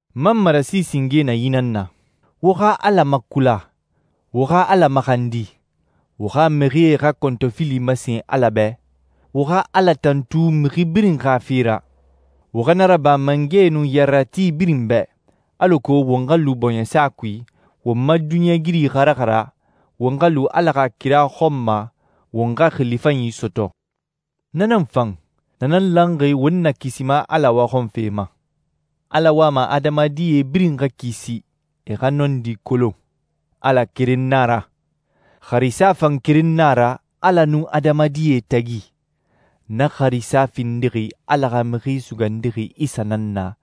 N ma marasi singe na yi nan na: Wo xa Ala makula, wo xa Ala maxandi, wo xa mixie xa kɔntɔfili masen Ala bɛ, wo xa Ala tantu mixi birin xa fe ra. Wo xa na raba mangɛe nun yarerati birin bɛ, alako won xa lu bɔɲɛsa kui, won ma duniɲɛigiri xa raxara, won xa lu Ala xa kira xɔn ma, won xa xili fanyi sɔtɔ. Na nan fan, na nan lanxi won Nakisima Ala waxɔnfe ma. Ala wama adamadie birin xa kisi, e xa nɔndi kolon. Ala keren na a ra. Xarisa fan keren nan a ra, Ala nun adamadie tagi. Na xarisa findixi Ala xa Mixi Sugandixi Isa nan na,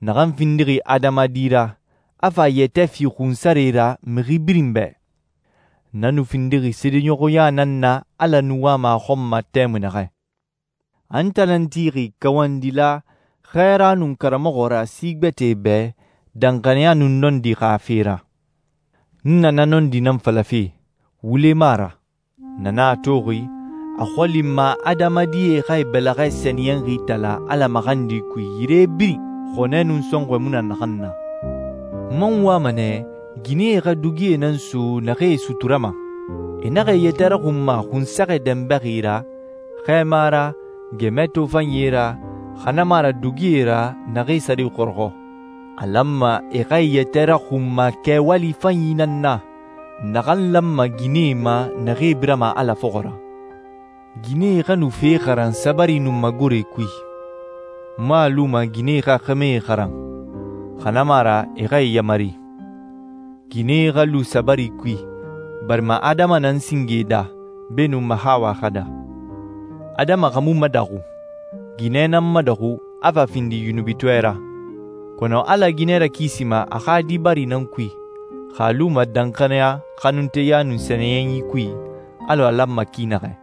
naxan findi adamadi ra, a fa a yɛtɛ fi xunsare ra mixi birin bɛ. Na nu findixi seedeɲɔxɔya nan na Ala nu wama a xɔn ma tɛmui naxɛ. A n tan nan tixi kawandila, xɛɛra, nun karamɔxɔ ra si gbɛtɛe bɛ danxaniya nun nɔndi xa fe ra. N na na nɔndi nan falafe, wule mu a ra. Na nan a toxi, a xɔli n ma adamadie xa e bɛlɛxɛ sɛniyɛnxie itala Ala maxandi kui yire birin xɔnɛ nun sɔnxɔ mu naxan na. N man wama nɛ ginɛe xa dugie nan so naxee e suturama. E naxa e yɛtɛ raxunma xunsɛxɛ dɛnbɛxi ra, xɛɛma ra, gɛmɛ tofanyie ra, xa na mu a ra dugie ra, naxee sare xɔrɔxɔ. A lanma e xa e yɛtɛ raxunma kɛwali fanyi nan na, naxan lanma ginɛe ma naxee birama Ala fɔxɔ ra. Ginɛe xa nu fe xaran sabari nun magore kui. N mu a luma ginɛe xa xɛmɛe xaran, xa na mu a ra e xa e yamari. Ginɛe xa lu sabari kui, barima Adama nan singe daa, beenun Mahawa xa daa. Adama xa mu madaxu. Ginɛ nan madaxu, a fa findi yunubitɔɛ ra. Kɔnɔ Ala ginɛ rakisima a xa di bari nan kui, xa a luma danxaniya, xanunteya, nun sɛniyɛnyi kui, alɔ a lanma ki naxɛ.